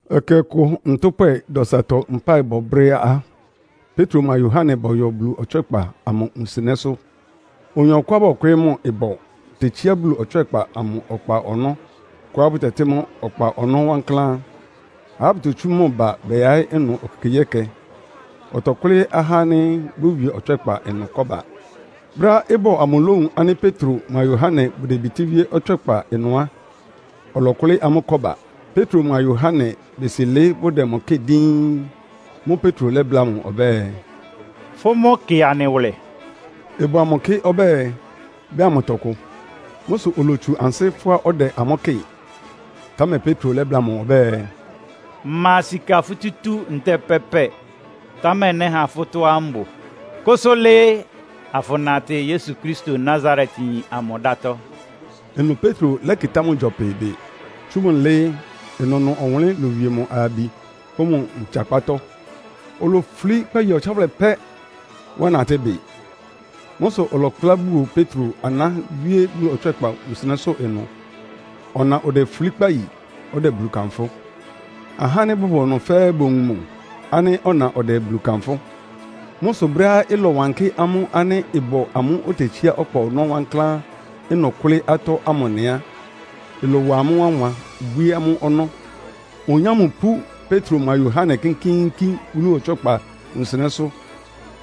Ɛkɛ ɔkʋ ntʋ́pwɛ dɔsatɔ mpáɩbɔ brɛ́ á, Petro mʋa Yohane bɔyɔ Bulu ɔtswɛ́kpa amʋ wunsɩnɛ́sʋ́. Oyin ɔkʋá bɔkwɩɩ́ mʋ ɩbɔ tetsíá Bulu ɔtswɛ́kpa amʋ ɔkpa ɔnɔ́ kʋá bʋtɛtɩ́ mʋ́ “Ɔkpa ɔnɔ́ Wankláán.” Ahá bʋtotsú mʋ ba bɛyaɩ́ ɩnʋ ekekegyíɛkɛ, ɔtɔkʋ́lɩ́ ahá ánɩ́ bówie Ɔtswɛ́kpa ɩnʋ kɔ́ba. Brɛ́á ɩbɔ amʋ lówun ánɩ́ Petro mʋa Yohane bʋdebitíwíé Ɔtswɛ́kpa ɩnʋ á, ɔlɔkʋlɩ́ amʋ́ kɔ́ba. Petro mʋa Yohane besi lɩ́ɩ́ bʋdɛ mʋ kɩ́ɩ díín. Mʋ́ʋ́ Petro lɛ́bláa mʋ ɔbɛ́ɛ, “Fʋ́ mʋ́ kɩ anɩ wʋlɛ.” Ɩbɔ amʋ kɩ ɔbɛ́ɛ, bɛ́ha mʋ tɔkʋ. Mʋ́ sʋ olotsu ansɩ́ fʋ́á ɔdɛ amʋ́ kɩ́ɩ. Támɛ Petro lɛ́bláa mʋ ɔbɛ́ɛ, “Mma sika futútú ntɛ́ɛ pɛ́pɛ, támɛ nɛ́ha fʋ́ tɔ́á mbʋ. Kʋsʋ lɩɩ, afʋnatɩ Yesu Kristo Nasaretyin amʋ dátɔ́!” Ɩnʋ Petro lɛ́kɩtá mʋ gyɔpɩ bɩ, tsú mʋ lɩ́ɩ́, ɩnʋnʋ ɔwʋnlɩ́n lowie mʋ ayabi pʋ́ mʋ ntsakpátɔ́. Olofulí kpáyi ɔtsáwʋlɛ pɛ́, wá natɩ́ bɩ. Mʋ́ sʋ ɔlɛkplá buo Petro aná wíé Bulu ɔtswɛ́kpa wunsɩnɛ́sʋ́ ɩnʋ; ɔna odefulí kpáyi; ɔdɛ Bulu kanfʋ́. Ahá ánɩ́ bʋbʋ ɩnʋ fɛ́ɛ́ bowun mʋ ánɩ́ ɔna ɔdɛ Bulu kanfʋ́. Mʋ́ sʋ brɛ́á ɩlɔwankɩ́ amʋ́ ánɩ́ ɩbɔ amʋ́ʋ́ otetsíá Ɔkpa Ɔnɔ́ Wankláán ɩnʋ kʋ́lɩ́ atɔ́ ámʋ nɩ á, ɩlɔwa amʋ́ wánwan, bwíé amʋ́ ɔnɔ́. Oyin ámʋ pú Petro mʋa Yohane kínkíínkín Bulu ɔtswɛ́kpa wunsɩnɛ́sʋ́,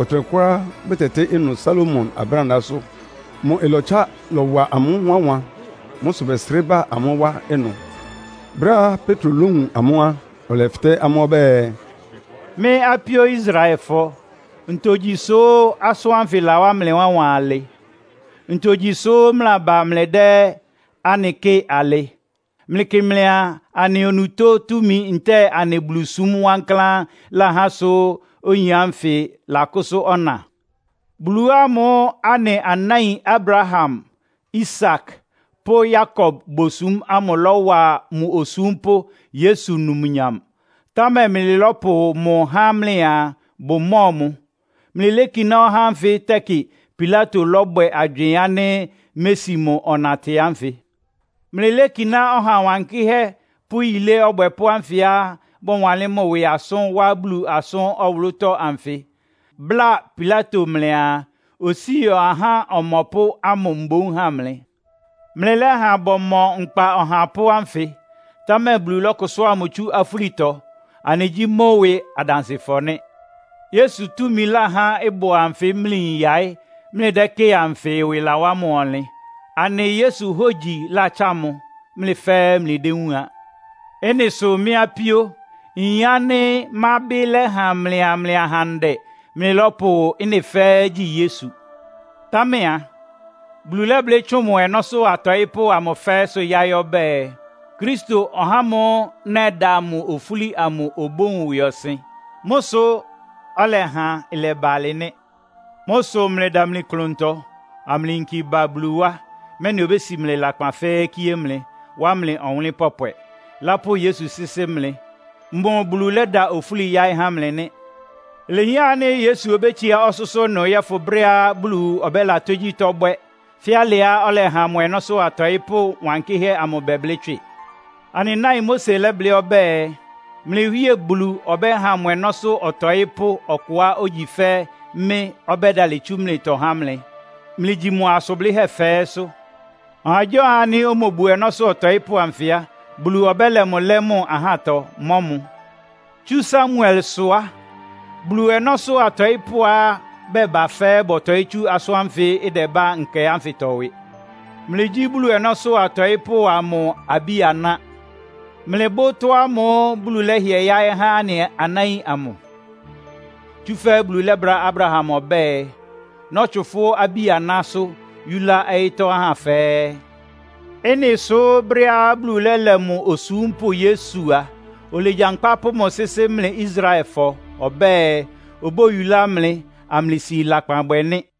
ɔtɩnɛkʋá bʋtɛtɩ́ ɩnʋ Salomo Abrándaásʋ́. Mʋ ɩlɔtsa lɔwa amʋ́ wánwan. Mʋ́ sʋ bɛsrɩ́ ba amʋ́ wá ɩnʋ. Brɛ́á Petro lówun amʋ́ á, ɔlɛfɩtɛ́ amʋ́ ɔbɛ́ɛ, “Mɩ́ apíó Israelfɔ, ntogyi sʋ́ asʋ́n ánfɩ lawá mlɩ wánwan alɩ? Ntogyi sʋ́ mlɩlaba mlɩdɛ́ anɩ kɩ́ɩ alɩ? Mlɩkɩ́ mlɩaa, anɩ onutó túmi ntɛ́ɛ anɩ Bulusúm wankláán láhá sʋ oyin ánfɩ lakʋ́sʋ́ ɔna? Bulu ámʋ́ʋ́ anɩ anáin Abraham, Isak pʋ́ Yakob bosúm ámʋ lɔ́wa mʋ osúmpʋ́ Yesu numnyam. Támɛ mlɩlɔ́pʋ mʋ há mlɩaa bʋmɔ́ɔ mʋ. Mlɩlékiná ɔhá ánfɩ tɛkɩ Pilato lɔ́bwɛ agywɩɩn ánɩ́ mési mʋ ɔnatɩ ánfɩ. Mlɩlékiná Ɔha Wankɩ́hɛ́ pʋ́ Yilé Ɔbwɛpʋ́ ánfɩá bɔwanlɩ́n mʋ ɩwɩ asʋ́n wá Bulu asʋ́n ɔwʋlʋ́tɔ́ anfɩ, bláa Pilato mlɩaa, osíi ahá ɔmɔpʋ́ ámʋ mboún ha mlɩ. Mlɩlɛ́ha bɔmɔ nkpa ɔhapʋ́ ánfɩ, támɛ Bulu lɔ́kʋsʋ́a mʋ tsú afúlitɔ. Anɩgyí mʋ́ ɩwɩ adansɩfɔ nɩ́. Yesu túmi láhá ɩbɔ anfɩ́ mlɩyin yaɩ́, mlɩdɛ́kɩ́ɩ anfɩ ɩwɩ lawá mʋ ɔnlɩn. Anɩ Yesu hógyi látsá mʋ, mlɩ fɛ́ɛ́ mlɩdéwúun a. “Ɩ́nɩ sʋ mɩ́ apíó, nyin ánɩ́ mábɩ́ lɛ́ha mlɩa mlɩ ahandɛ mlɩlɔ́pʋ ɩ́nɩ fɛ́ɛ́ gyi Yesu. Támɛ a, Bulu lɛ́blɩ́ tsʋn mʋ ɔnɔ́sʋ́ atɔɩ́pʋ́ amʋ fɛ́ɛ́sʋ́ yáɩ́ ɔbɛ́ɛ, ‘Kristo, (ɔhá ámʋ́ʋ́ nɛda mʋ ofúli amʋ) obówun ɩwɩɔsɩn.’ Mʋ́ sʋ ɔlɛha ɩlɛba alɩ nɩ́. Mʋ́ sʋ mlɩdamli klʋntɔ, amlɩyinki ba Bulu wá, mɛ́nɩ obési mlɩ lakpan fɛ́ɛ́ kíé mlɩ, wá mlɩ ɔwʋnlɩ́n pɔpwɛ, lápʋ́ Yesu sɩ́sɩ́ mlɩ. Mʋ Bulu lɛ́da ofúli yáɩ́ há mlɩ nɩ́. Ilehián ánɩ́ Yesu obétsiá ɔsʋ́sʋ́ ɩnʋ yɔ́fʋn brɛ́á Bulu ɔbɛ́la tógyítɔ́ bwɛ́, fɛ́ alɩá ɔlɛha mʋ ɔnɔ́sʋ́ atɔɩ́pʋ́ wankɩ́hɛ́ amʋ bɛblɩ́ tswɩ. Anɩ náin Mose lɛ́blɩ́ ɔbɛ́ɛ, ‘Mlɩ Wíe Bulu ɔbɛ́ha mʋ ɔnɔ́sʋ́ ɔtɔɩ́pʋ́ ɔkʋá ogyi fɛ́ mɩ́ ɔbɛ́dalɩ tsú mlɩtɔ há mlɩ. Mlɩgyi mʋ asʋn blɩ́hɛ́ fɛ́ɛ́sʋ́. Ɔhagyíɔha ánɩ́ omobu ɔnɔ́sʋ́ ɔtɔɩ́pʋ́ anfɩ á, Bulu ɔbɛ́lɛ mʋ lɛ́ mʋ ahátɔ, mɔ́ mʋ.’ “Tsú Samuelsʋ á, Bulu ɔnɔ́sʋ́ atɔɩ́pʋ́á bɛba fɛ́ɛ́ bɔtɔɩ́ tsú asʋ́n ánfɩ ɩdɛbá nkɛ ánfɩtɔ ɩwɩ. Mlɩgyí Bulu ɔnɔ́sʋ́ atɔɩ́pʋ́ amʋ abí-aná. Mlɩbʋ́ ɩtɔ́ ámʋ́ʋ́ Bulu lɛ́hɩɛ yáɩ́ há anɩ anáin amʋ. Tsúfɛ́ Bulu lɛ́bláa Abraham ɔbɛ́ɛ, ‘Nɔ́tsʋn fʋ́ abí-anásʋ́ yúlá ɔyɩ́tɔ́ ahá fɛ́ɛ́.’ Ɩ́nɩ sʋ́ brɛ́á Bulu lɛ́lɛ mʋ osúmpʋ́ Yesu a, olegyankpá pʋ́ mʋ sɩ́sɩ́ mlɩ Israelfɔ, ɔbɛ́ɛ obóyulá mlɩ, amlɩsi lakpan bwɛ nɩ́.”